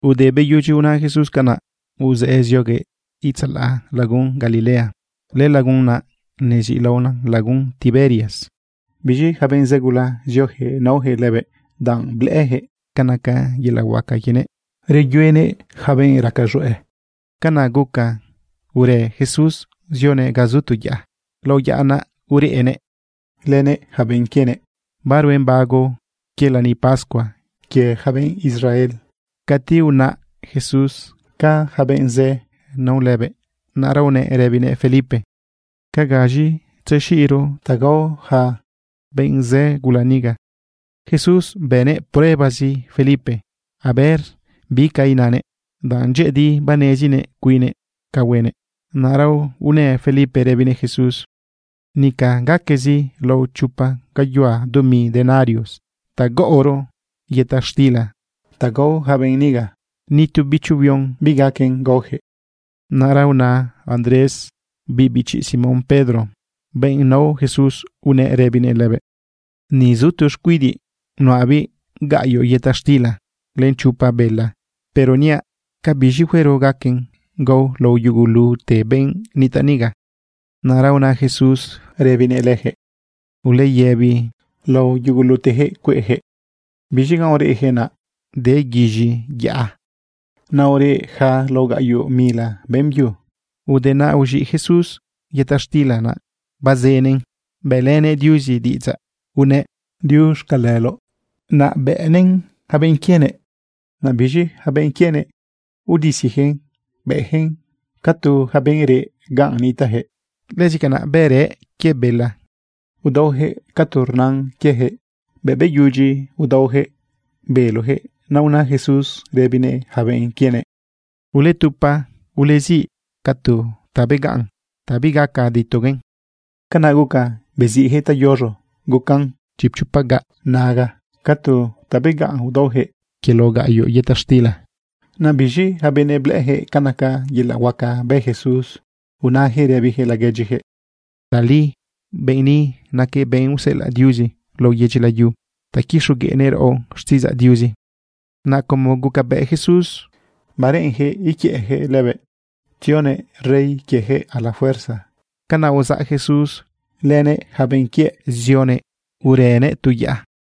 Te beyudyi una Jesús canaꞌ, uzëꞌë zioguëꞌ itzalaꞌ lagun Galilea. Lëlagun naꞌ neziꞌlaona lagun Tiberias. Biz̃i yaca benꞌ zë gula zioyaquëꞌ naoyaquëꞌ lëbëꞌ, danꞌ blëꞌëyaquëꞌ ca naca yelaꞌ huaca quienëꞌ reyuenëꞌ yaca benꞌ raca z̃hueꞌ. Canaꞌ guca urë Jesús zionëꞌ ga zu tu yaꞌa. Lao yaꞌa naꞌ ureꞌnëꞌ lënëꞌ yaca benꞌ quienëꞌ. Baruen bago quie lani pascua quie yaca benꞌ Israel. Cati unaꞌ Jesús ca yaca benꞌ zë nao lëbëꞌ, naꞌra unëꞌ rëbinëꞌ Felipe: ―¿Ca gaz̃i tzexiꞌro ta gao yaca benꞌ zë gula niga? Jesús bënëꞌ pruebazi Felipe a ver bi ca inanëꞌ, danꞌ dyëꞌëdi banezinëꞌ cuinnëꞌ ca huenëꞌ. Naꞌra unë Felipe rëbinëꞌ Jesús: ―Nica gaquezi lao chopa gayuhua dumi denarios ta gaꞌoro yëta xtila ta gao yaca benꞌ niga. Ni tu bicho huion bigaquen gaoyaquëꞌ. Naꞌra una Andrés, biꞌ bichi Simón Pedro, benꞌ nao Jesús, unëꞌ rëbinëꞌ lëbëꞌ: ―Ni zu tu xcuidiꞌ nuꞌabiꞌ gaꞌyoꞌ yëta xtila len chopa bela, pero niaꞌ ¿ca biz̃i huero gaquen gao lao yugulute benꞌ nitaꞌ niga? Naꞌra una Jesús rëbinëꞌ leyaquëꞌ: ―Uleyëbi lao yuguluteyaquëꞌ cueꞌyaquëꞌ. Biz̃i ganꞌ ureꞌyaquëꞌ, naꞌ de guiz̃i yaꞌa. Naꞌ ureꞌ yaca lao gaꞌyoꞌ mila beꞌmbyu. Ude naꞌ uz̃iꞌ Jesús yëta xtila naꞌ, bazënëꞌn bëꞌlënëꞌ Diuzi diꞌidzaꞌ unëꞌ: “Diuxcaleloꞌ”, naꞌ bëꞌnëꞌn yaca benꞌ quienëꞌ. Naꞌ biz̃i yaca benꞌ quienëꞌ, udisiyaquëꞌn bëꞌyaquëꞌn ca tu yaca benꞌ reꞌ ganꞌ nitaꞌyaquëꞌ. Lëzi canaꞌ bërëꞌ quie bela, udaoyaquëꞌ ca tu rnan quieyaquëꞌ. Bëꞌ beyudyi udaoyaquëꞌ beloyaquëꞌ, naꞌ una Jesús rëbinëꞌ yaca benꞌ quienëꞌ: ―Uletupa, uleziꞌ ca tu ta begaꞌn ta bigaca ditoguen. Canaꞌ guca yeziꞌyaquëꞌ tayoz̃o gucan lao chipchopa gaꞌ naga ca tu ta begaꞌn udaoyaquëꞌ quie lao gaꞌyoꞌ yëta xtila. Naꞌ biz̃i yaca benëꞌ blëꞌëyaquëꞌ ca naca yelaꞌ huaca bë Jesús, unayaquëꞌ rëbiyaquëꞌ laguedyiyaquëꞌ: ―Tali benꞌ ni naquëꞌ benꞌ useꞌelaꞌ Diuzi lao yedyi layu ta quixogueꞌnëꞌ raꞌo xtiꞌidzaꞌ Diuzi. Naꞌ como gucabëꞌ Jesús bareꞌenyaquëꞌ iquiëꞌyaquëꞌ lëbëꞌ tzionëꞌ rey quieyaquëꞌ a la fuerza, canaꞌ uzaꞌ Jesús lënëꞌ yaca benꞌ quiëꞌ zionëꞌ urënëꞌ tu yaꞌa.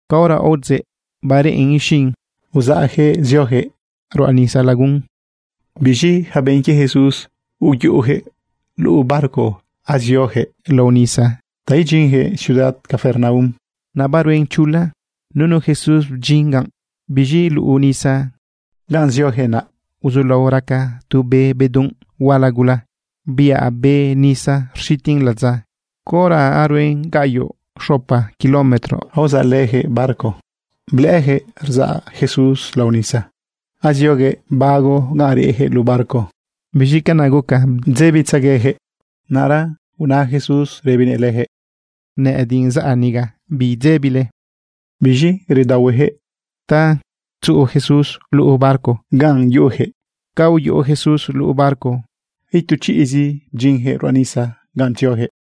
Caora aodzeꞌ bareꞌen ixin, uzaꞌyaquëꞌ zioyaquëꞌ ruꞌa nisa lagun. Biz̃i yaca benꞌ quie Jesús, uyuꞌuyaquëꞌ luꞌu barco azioyaquëꞌ lao nisa ta idyinyaquëꞌ ciudad Capernaum. Naꞌ baruen chula, nunu Jesús bdyin ganꞌ. Biz̃i luꞌu nisa ganꞌ zioyaquëꞌ naꞌ, uzulao raca tu be bedunꞌ huala gula, biꞌa be nisa rxitin ladza. Caora aruen gaꞌyoꞌ xopa kilómetro aozaꞌlëyaquëꞌ barco, blëꞌëyaquëꞌ rzaꞌ Jesús lao nisa, azioguëꞌ bago ganꞌ reꞌyaquëꞌ luꞌu barco. Biz̃i canaꞌ guca bdzebitzegueyaquëꞌ. Naꞌra una Jesús rëbinëꞌ leyaquëꞌ: ―Nëꞌëdiꞌ zaꞌ niga, bidzebile. Biz̃i redaohueyaquëꞌ ta tzuꞌu Jesús luꞌu barco ganꞌ yuꞌuyaquëꞌ. Ca uyuꞌu Jesús luꞌu barco itu chiꞌzi bdyinyaquëꞌ ruꞌa nisa ganꞌ tzioyaquëꞌ.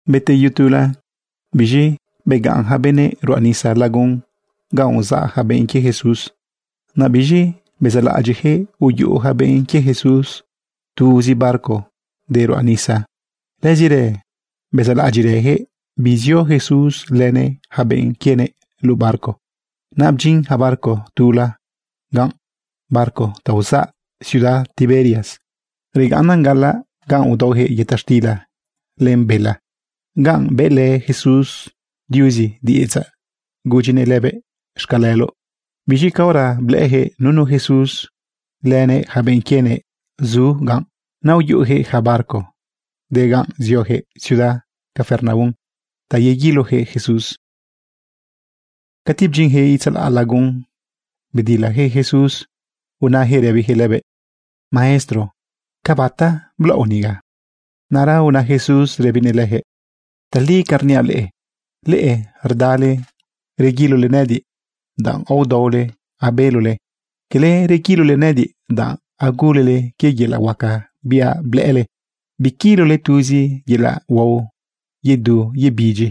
Beteyu tula, biz̃i begaꞌn yaca benëꞌ ruꞌa nisa lagun ganꞌ uzaꞌ yaca benꞌ quie Jesús. Naꞌ biz̃i bezaꞌlaꞌadyiꞌyaquëꞌ uyuꞌu yaca benꞌ quie Jesús tuzi barco de ruꞌa nisa. Lëzirë bezaꞌlaꞌadyiꞌrëyaquëꞌ bizio Jesús lënëꞌ yaca benꞌ quienëꞌ luꞌu barco. Naꞌ bdyin yaca barco tula ganꞌ, barco ta uzaꞌ ciudad Tiberias. Regaꞌnnan gaꞌalaꞌ ganꞌ udaoyaquëꞌ yëta xtila len bela, ganꞌ bëꞌlë Jesús Diuzi diꞌidzaꞌ gudyinëꞌ lëbëꞌ: “Xcaleloꞌ”. Biz̃i caora blëꞌëyaquëꞌ nunu Jesús lënëꞌ yaca benꞌ quienëꞌ zu ganꞌ, naꞌ uyuꞌuyaquëꞌ yaca barco de ganꞌ zioyaquëꞌ ciudad Capernaum ta yeguiloyaquëꞌ Jesús. Cati bdyinyaquëꞌ itzalaꞌ lagun, bedilayaquëꞌ Jesús unayaquëꞌ rëbiyaquëꞌ lëbëꞌ: ―Maestro, ¿ca bata blaoꞌ niga? Naꞌra una Jesús rëbinëꞌ leyaquëꞌ: ―Tali ca rniaꞌ leꞌe, leꞌe rdale reguilole nëꞌëdiꞌ danꞌ aodaole abelole. Cala reguilole nëꞌëdiꞌ danꞌ agulele quie yelaꞌ huaca biaꞌ blëꞌële. Biquilole tuzi yelaꞌ huao yedu yebidyi.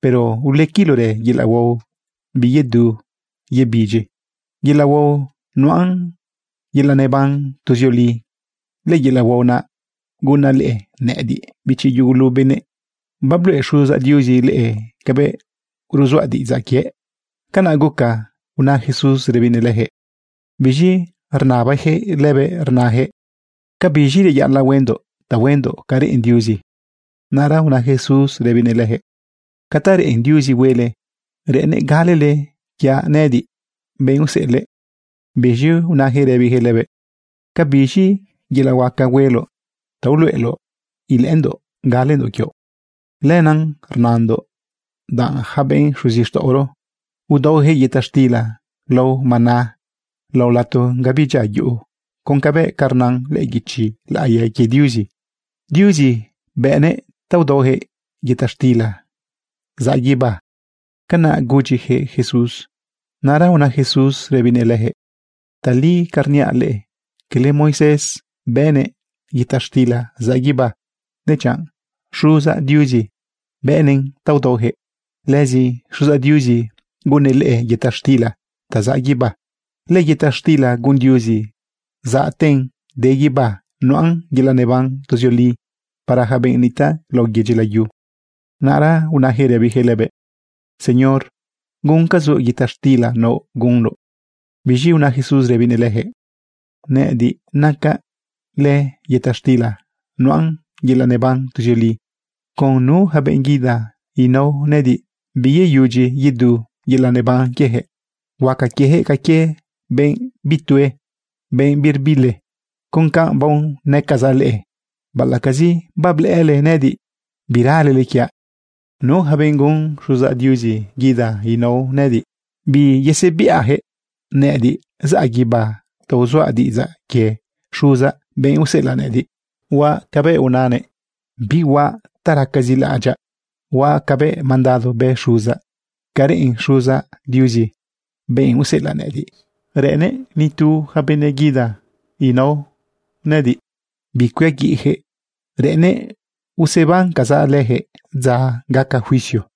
pero ulequilorë yelaꞌ huao biyedu yebidyi, yelaꞌ huao nuꞌan yelaꞌ neban tuzioli. Lëyelaꞌ huao naꞌ gunaꞌ leꞌe. Nëꞌëdiꞌ, bichi yugulu benëꞌ, babluꞌe Xuzaꞌ Diuzi leꞌe cabëꞌ ruzuaꞌ diꞌidzaꞌ quiëꞌ. ―Canaꞌ guca una Jesús rëbinëꞌ leyaquëꞌ. Biz̃i rnabayaquëꞌ lëbëꞌ rnayaquëꞌ: ―¿Ca biz̃i reyaꞌalaꞌ huendoꞌ ta huendoꞌ ca reꞌen Diuzi? Naꞌra una Jesús rëbinëꞌ leyaquëꞌ: ―Ca ta reꞌen Diuzi huele, reꞌennëꞌ galele quiaꞌ nëꞌëdiꞌ, benꞌ useꞌelëꞌ. Biz̃i unayaquëꞌ rëbiyaquëꞌ lëbëꞌ: ―¿Cabiz̃i yelaꞌ huaca hueloꞌ ta uluꞌeloꞌ ilëꞌëndoꞌ galendoꞌ quioꞌ? Lenaꞌ rnandoꞌ danꞌ yaca benꞌ xuzixtaꞌoro udaoyaquëꞌ yëta xtila lao maná lao lato ga bidyia yuꞌu con cabëꞌ ca rnan lëꞌë guichi laꞌiya quie Diuzi: “Diuzi bëꞌnëꞌ ta udaoyaquëꞌ yëta xtila zaꞌ guibá.” ―Canaꞌ gudyiyaquëꞌ Jesús. Naꞌra una Jesús rëbinëꞌ leyaquëꞌ: ―Tali ca rniaꞌ leꞌe. Cala Moisés bëꞌnëꞌ yëta xtila zaꞌ guibá, dechanꞌ Xuzaꞌ Diuzi bëꞌnëꞌn ta udaoyaquëꞌ. Lëzi Xuzaꞌ Diuzi gunnëꞌ leꞌe yëta xtila ta zaꞌ guibá. Lëyëta xtila gun Diuzi zaꞌten de guibá nuꞌan yelaꞌ neban tuzioli para yaca benꞌ nitaꞌ lao yedyi layu. Naꞌra unayaquëꞌ rëbiyaquëꞌ lëbëꞌ: ―Señor, guncazoꞌ yëta xtila nao gunoꞌ. Biz̃i una Jesús rëbinëꞌ leyaquëꞌ: ―Nëꞌëdiꞌ nacaꞌ lëyëta xtila nuꞌan yelaꞌ neban tuzioli. Con nu yaca benꞌ guida nao nëꞌëdiꞌ, biyeyudyi yedu yelaꞌ neban quieyaquëꞌ. Huaca quieyaquëꞌ ca quie benꞌ bitue, benꞌ birbili. Con canꞌ baonëcazaꞌ leꞌe, baꞌalaꞌcazi bablëꞌële nëꞌëdiꞌ, biralele quiaꞌ. Nu yaca benꞌ gun Xuzaꞌ Diuzi guida nao nëꞌëdiꞌ, biyesebiꞌayaquëꞌ. Nëꞌëdiꞌ zaꞌ guibá ta uzuaꞌ diꞌidzaꞌ quie Xuzaꞌ, benꞌ useꞌelaꞌ nëꞌëdiꞌ. Huaꞌ cabëꞌ unanëꞌ, bihuaꞌ ta racazi laꞌadyaꞌ. Huaꞌ cabëꞌ mandado bë Xuzaꞌ. Ca reꞌen Xuzaꞌ Diuzi, benꞌ useꞌelaꞌ nëꞌëdiꞌ, reꞌennëꞌ ni tu yaca benëꞌ guida nao nëꞌëdiꞌ bicuiaguiꞌyaquëꞌ. Reꞌennëꞌ usebancazaꞌ leyaquëꞌ dza gaca juicio.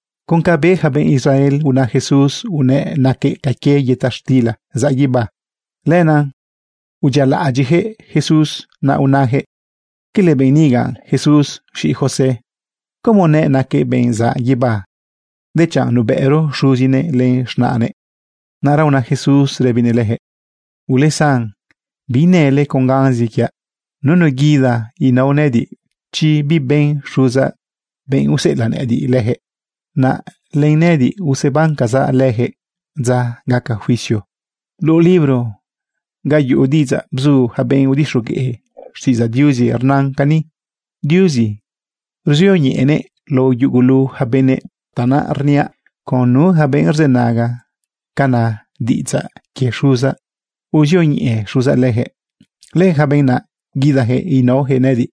Con ca be yaca benꞌ Israel una Jesús unëꞌ naquëꞌ ca quie yëta xtila zaꞌ guibá, lenaꞌ udyialaꞌadyiꞌyaquëꞌ Jesús. Naꞌ nayaquëꞌ: ―¿Cala benꞌ niga Jesús, z̃iꞌi José? ¿Cómo nëꞌ naquëꞌ benꞌ zaꞌ guibá, dechanꞌ nubëꞌro xuzinëꞌ len z̃naꞌnëꞌ? Naꞌra una Jesús rëbinëꞌ leyaquëꞌ: ―Ulesan, biinële con ganzi quiaꞌ. Nunu guida nao nëꞌëdiꞌ, chi biben Xuzaꞌ, benꞌ useꞌelaꞌ nëꞌëdiꞌ, leyaquëꞌ. Naꞌ lënëꞌëdiꞌ usebancazaꞌ leyaquëꞌ dza gaca juicio. Luꞌu libro ga yuꞌu diꞌidzaꞌ bzu yaca benꞌ udixogueꞌ xtiꞌidzaꞌ Diuzi rnan cani: “Diuzi ruzioñeꞌenëꞌ lao yugulu yaca benëꞌ.” Tanaꞌ rniaꞌ, con nu yaca benꞌ rzënaga ca na diꞌidzaꞌ quie Xuzaꞌ, uzioñeꞌe Xuzaꞌ leyaquëꞌ. Lëyaca benꞌ naꞌ guidayaquëꞌ inaoyaquëꞌ nëꞌëdiꞌ.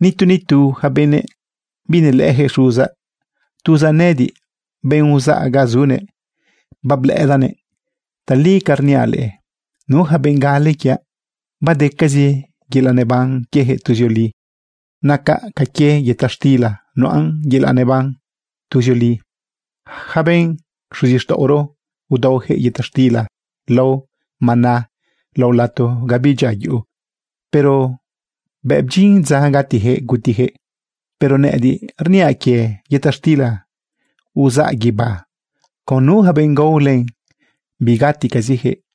’Nitu nitu yaca benëꞌ binelëꞌëyaquëꞌ Xuzaꞌ. Tuzaꞌ nëꞌëdiꞌ, benꞌ uzaꞌ ga zunëꞌ, bablëꞌëdaꞌnëꞌ. Tali ca rniaꞌ leꞌe, nu yaca benꞌ gale quiaꞌ, badecazi yelaꞌ neban quieyaquëꞌ tuzioli. Nacaꞌ ca quie yëta xtila nuꞌan yelaꞌ neban tuzioli. Yaca benꞌ xuzixtaꞌoro udaoyaquëꞌ yëta xtila lao maná lao lato ga bidyia yuꞌu, pero bëꞌ bdyin dza gatiyaquëꞌ gutiyaquëꞌ. Pero nëꞌëdiꞌ rniaꞌ quie yëta xtila uzaꞌ guibá, con nu yaca benꞌ gao len, bigaticaziyaquëꞌ.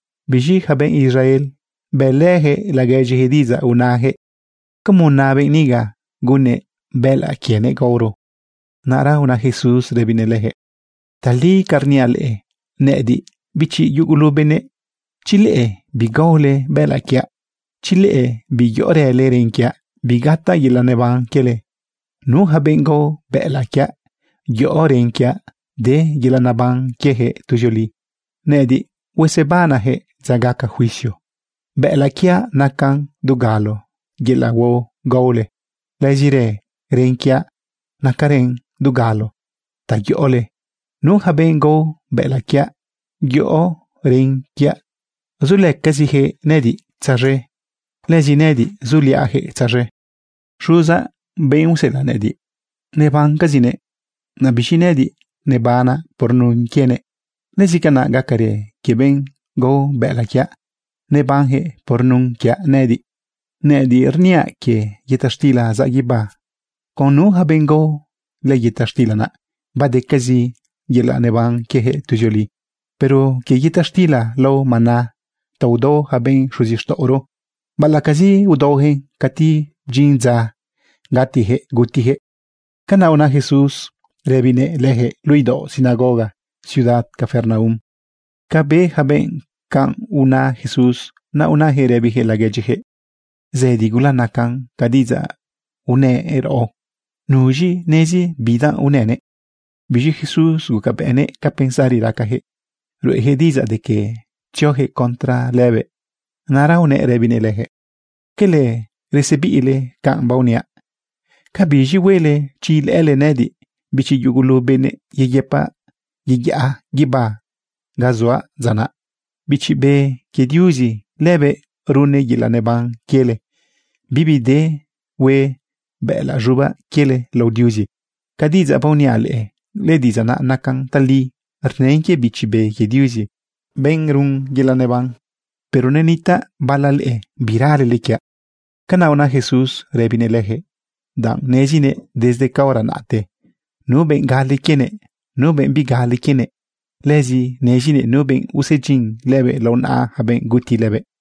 Biz̃i yaca benꞌ Israel bëꞌlëyaquëꞌ laguedyiyaquëꞌ diꞌidzaꞌ unayaquëꞌ: ―¿Cómo na benꞌ niga gunnëꞌ bëꞌëlaꞌ quienëꞌ gaoro? Naꞌra una Jesús rëbinëꞌ leyaquëꞌ: ―Tali ca rniaꞌ leꞌe, nëꞌëdiꞌ bichi yugulu benëꞌ, chi leꞌe bigaole bëꞌëlaꞌ quiaꞌ, chi leꞌe biyoꞌorële ren quiaꞌ, bigataꞌ yelaꞌ neban quiele. Nu yaca benꞌ gao bëꞌëlaꞌ quiaꞌ yoꞌo ren quiaꞌ, de yelaꞌ neban quieyaquëꞌ tuzioli. Nëꞌëdiꞌ huesebanaꞌyaquëꞌ dza gaca juicio. Bëꞌëlaꞌ quiaꞌ nacan dugalo yelaꞌ huao gaole. Lëzirë ren quiaꞌ nacarën dugalo ta yoꞌole. Nu yaca benꞌ gao bëꞌëlaꞌ quiaꞌ, yoꞌo ren quiaꞌ, zulëcaziyaquëꞌ nëꞌëdiꞌ tzaz̃e, lëzi nëꞌëdiꞌ zuliaꞌyaquëꞌ tzaz̃e. Xuzaꞌ, benꞌ useꞌelaꞌ nëꞌëdiꞌ, nebancazinëꞌ. Naꞌ biz̃i nëꞌëdiꞌ, nebanaꞌ por nun quienëꞌ. Lëzi canaꞌ gacarë quie benꞌ gao bëꞌëlaꞌ quiaꞌ, nebanyaquëꞌ por nun quiaꞌ nëꞌëdiꞌ. Nëꞌëdiꞌ rniaꞌ quie yëta xtila zaꞌ guibá. Con nu yaca benꞌ gao lëyëta xtila naꞌ, badecazi yelaꞌ neban quieyaquëꞌ tuzioli. Pero quie yëta xtila lao maná ta udao yaca benꞌ xuzixtaꞌoro, baꞌalaꞌcazi udaoyaquëꞌn, cati bdyin dza gatiyaquëꞌ gutiyaquëꞌ. Canaꞌ una Jesús rëbinëꞌ leyaquëꞌ, luꞌu idaoꞌ sinagoga ciudad Capernaum. Ca be yaca benꞌ canꞌ unao Jesús, naꞌ unayaquëꞌ rëbiyaquëꞌ laguedyiyaquëꞌ: ―Zëdi gula naca ca diꞌidzaꞌ unëꞌ raꞌo. ¿Nuz̃i nezi bidanꞌ unënëꞌ? Biz̃i Jesús gucabëꞌnëꞌ ca pensari racayaquëꞌ ruꞌeyaquëꞌ diꞌidzaꞌ de que tziojëꞌ contra lëbëꞌ. Naꞌra unëꞌ rëbinëꞌ leyaquëꞌ: ―¿Quele resebiꞌle canꞌ baoniaꞌ? ¿Cabiz̃i huele chi ilëꞌële nëꞌëdiꞌ, bichi yugulu benëꞌ, yeyëpaꞌ yeyaꞌa guibá ga zuaꞌ dza naꞌ? Bichi Be quie Diuzi, lëbëꞌ runnëꞌ yelaꞌ neban quiele. Bibi de hue bëꞌëlaꞌ z̃ubaꞌ quiele lao Diuzi. Ca diꞌidzaꞌ baoniaꞌ leꞌe, lëdiꞌidzaꞌ naꞌ nacan tali, rnën quie Bichi Be quie Diuzi, benꞌ run yelaꞌ neban. Pero nenitaꞌ bala leꞌe biralele quiaꞌ. Canaꞌ una Jesús rëbinëꞌ leyaquëꞌ, danꞌ nezinëꞌ desde caora naꞌte nu benꞌ gale quienëꞌ, nu benꞌ bigale quienëꞌ. Lëzi nezinëꞌ nu benꞌ usedyin lëbëꞌ lao naꞌa yaca benꞌ guti lëbëꞌ.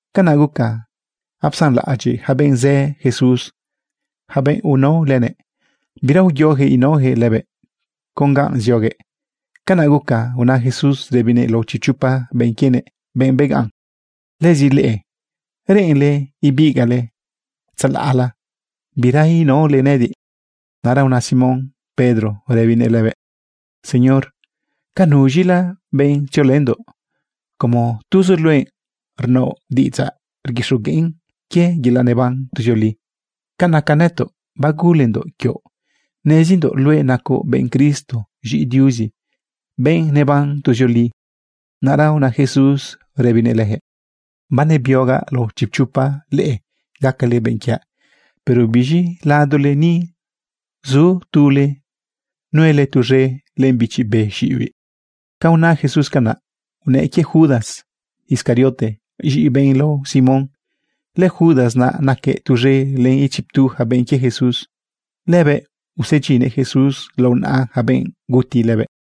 Canaꞌ guca apsanlaꞌadyiꞌ yaca benꞌ zë Jesús, yaca benꞌ unao lënëꞌ. Bira uyoyaquëꞌ inaoyaquëꞌ lëbëꞌ con ga zioguëꞌ. Canaꞌ guca una Jesús rëbinëꞌ lao chipchopa benꞌ quienëꞌ, benꞌ begaꞌn: ―Lëzi leꞌe, ¿reꞌenle ibigaꞌle tzalaꞌla, bira inaole nëꞌëdiꞌ? Naꞌra una Simón Pedro rëbinëꞌ lëbëꞌ: ―Señor, ¿ca nuz̃ila benꞌ tziolëndoꞌ, como tuzoꞌ luëꞌ rnaoꞌ diꞌidzaꞌ rguixogueꞌn quie yelaꞌ neban tuzioli? Ca naca nëtoꞌ, bagulendoꞌ quioꞌ. Nezindoꞌ luëꞌ nacoꞌ benꞌ Cristo z̃iꞌi Diuzi, benꞌ neban tuzioli. Naꞌra una Jesús rëbinëꞌ leyaquëꞌ: ―Banebiogaꞌ lao chipchopa leꞌe gacale benꞌ quiaꞌ, pero biz̃i ladole ni, zu tule nuelë tuz̃e len bichi be xiꞌibiꞌ. Ca una Jesús canaꞌ, unëꞌ quie Judas Iscariote, z̃iꞌi benꞌ lao Simón. LëJudas naꞌ naquëꞌ tuz̃e len ichiptu yaca benꞌ quie Jesús. Lëbëꞌ usedyinnëꞌ Jesús lao naꞌa yaca benꞌ guti lëbëꞌ.